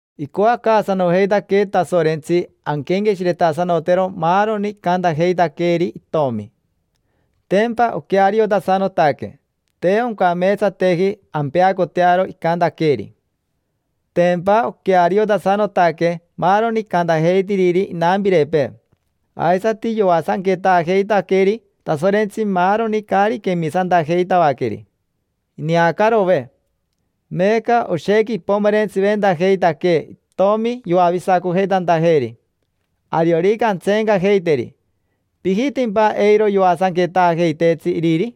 Icoacaasanojeitaquee Tasorentsi anquenqueshiretasanotero maaroni icantajeitaqueeri Itomi: tempa oqueariotasanotaque, te oncameetsateji ampeacotearo icantaqueeri. Tempa oqueariotasanotaque maaroni icantajeitiriri inampirepee, aisati yoasanquetaajeitaqueri Tasorentsi maaroni caari quemisantajeitavaqueri: ineacarove. Meeca oshequi ipomerentsiventajeitaquee Itomi yoavisacojeitantajeeri. Ariorica antseencajeiteri, ¿pijitimpa eiro yoasanquetaajeiteetsi iriri?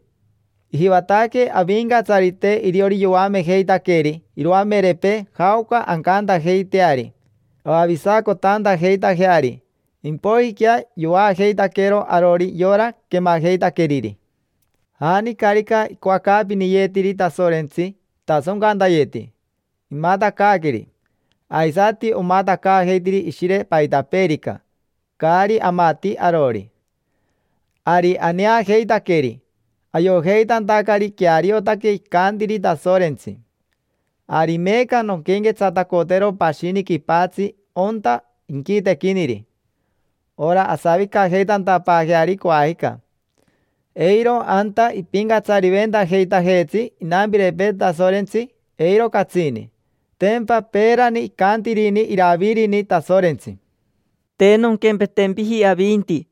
Ijivataque Avincatsarite iriori yoamejeitaqueri iroamerepee jaoca ancantajeiteari avavisacotantajeitajeari; impoijiquea yovaajeitaqueero arori yora quemajeitaqueriri. Janicarica icoacaapiniyetiri Tasorentsi itasoncantayeti, imatacaaqueri; aisati omatacaajeitiri Ishire paitapeerica, caari amati arori. Ari aneajeitaqueri, ayojeitantacari queariotaque icantiri Tasorentsi. Ari meeca nonquenquetsatacotero pashini quipatsi onta inquitequiniri: ora asavicajeitantapaajeari coajica. Eiro anta ipincatsariventajeitajeetsi inampirepee Tasorentsi, eiro catsini. Tempa peerani icantirini Iravirini Tasorentsi: “Te nonquempetempiji avinti,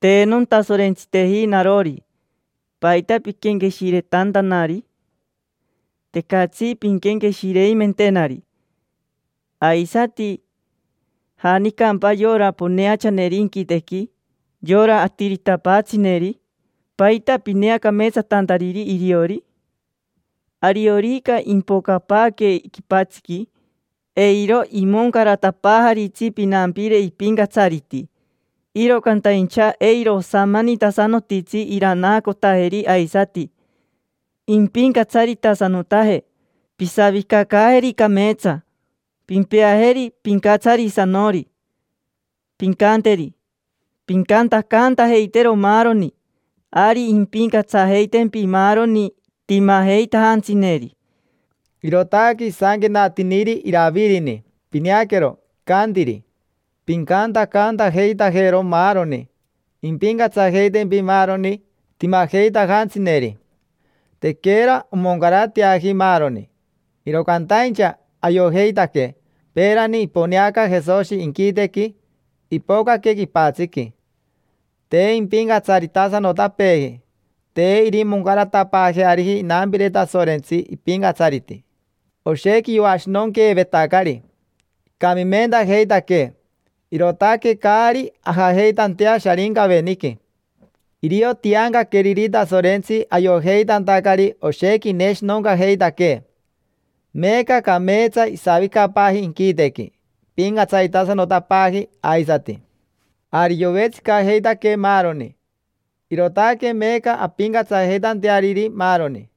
te nontasorentsiteji narori. ¿Paita piquenqueshiretantanari? Tecatsi pinquenqueshireimentenari. Aisati, ¿janicampa yora poneachaneri inquitequi, yora atiritapaatsineri? ¿Paita pineacameetsatantariri iriori? Ariorica impocapaaque quipatsiqui, eiro imoncaratapaajaritsi pinampire ipincatsariti. Iro cantaincha eiro osamanitasanotitsi iranaacotajeri aisati, impincatsaritasanotaje. Pisavicacaajeri cameetsa, pimpeajeri pincatsarisanori. Pincanteri: ‘Pincantacantajeitero maaroni. Ari impincatsajeitempi maaroni timajeitajantsineri’”. Irootaque isanquenatiniri Iravirini. Pineaquero, icantiri: “Pincantacantajeitajero maaroni, impincatsajeitempi maaroni timajeitajantsineri”. Tequera omoncarateaji maaroni, iro cantaincha ayojeitaque peerani iponeanaca Jesoshi inquitequi, ipocaque quipatsiqui. Te impincatsaritasanotapeeji, te irimoncaratapaajeariji inampire Tasorentsi ipincatsariti. Oshequi yoashinonqueevetacari, icamimentajeitaquee, irootaque caari ajajeitantea Sharincaveniqui. Irio tiancaqueriri Tasorentsi ayojeitantacari oshequi ineshinoncajeitaquee. Meeca cameetsa isavicapaaji inquitequi, ipincatsaritasanotapaaji aisati. Ari yovetsicajeitaquee maaroni, irootaque meeca ampincatsajeitanteariri maaroni;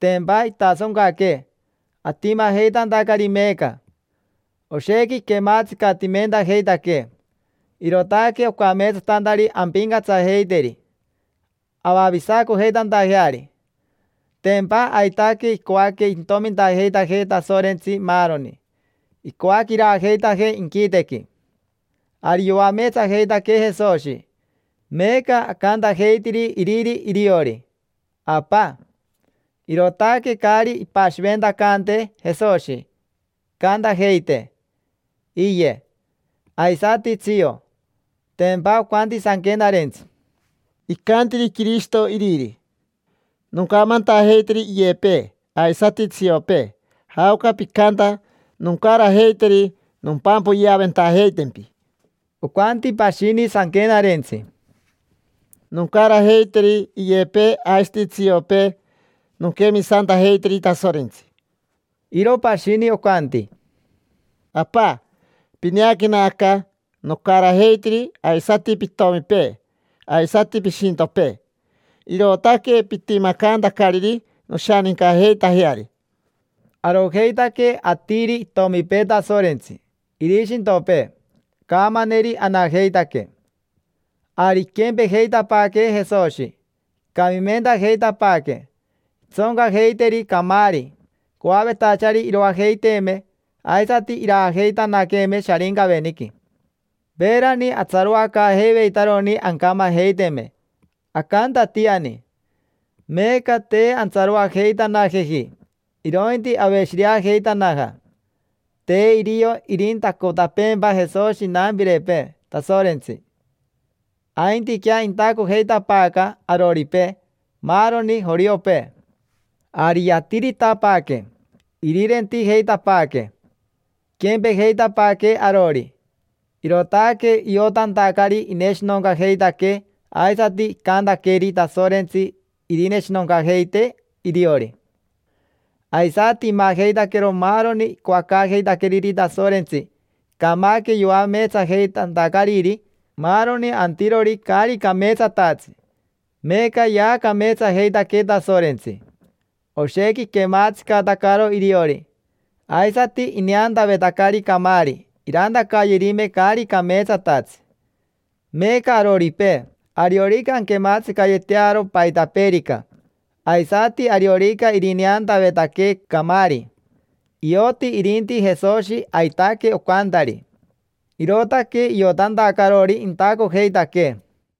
tempa itasoncaquee atimajeitantacari meeca. Oshequi iquematsicatimentajeitaquee, irootaque ocameetsatantari ampincatsajeiteri, avavisacojeitantajeari; tempa aitaque icoaque intomintajeitajee Tasorentsi maaroni, icoaque iraajeitajee inquitequi. Ari yoameetsajeitaquee Jesoshi, meeca acantajeitiri Iriri iriori: “Apa”. Irootaque caari ipashiventacantee Jesoshi icantajeitee: “Iye”, aisati: “Tsio”. Tempa ocanti Sanquenarentsi: “Icantiri Quirishito Iriri: ‘Noncamantajeiteri iyepee aisati tsiopee jaoca picanta; noncarajeiteri nompampoyaventajeitempi’”. Ocanti pashini Sanquenarentsi: “Noncarajeiteri iyepee aisati tsiopee nonquemisantajeiteri Tasorentsi”. Iro pashini ocanti: “Apa, pineaquena aca, nocarajeitiri aisati pitomipee, aisati pishintopee. Irootaque pitimacantacariri noshanincajeitajeari”. Arojeitaque atiri itomipee Tasorentsi, irishintopee; caamaneri anajeitaque. Ari iquempejeitapaaquee Jesoshi, icamimentajeitapaaquee. Intsoncajeiteri camaari, coavetachari iroajeiteeme aisati iraajeitanaqueeme Sharincaveniqui. Peerani atsaroacaajeiveitaroni ancamajeiteme, acantatiani; meeca te antsaroajeitanajeji, irointi aveshireajeitanaja. Te irio irintacotapeempa Jesoshi inampirepee Tasorentsi, aintiquea intacojeitapaaca aroripee: maaroni joriopee. Ari yatiritapaaque, irirentijeitapaaquee; iquempejeitapaaquee arori, irootaque iotantacari ineshinoncajeitaquee aisati icantaqueri Tasorentsi irineshinoncajeitee iriori. Aisati imajeitaquero maaroni icoacaajeitaqueriri Tasorentsi, icamaque yoameetsajeitantacariri maaroni antirori caari cameetsatatsi, meeca yaacameetsajeitaquee Tasorentsi. Oshequi iquematsicatacaro iriori; aisati ineantavetacari camaari, irantacayerime caari cameetsatatsi. Meeca aroripee, ariorica anquematsicayetearo paitapeerica, aisati ariorica irineantavetaquee camaari, ioti irinti Jesoshi aitaque ocantari. Irootaque iotantacarori intacojeitaquee.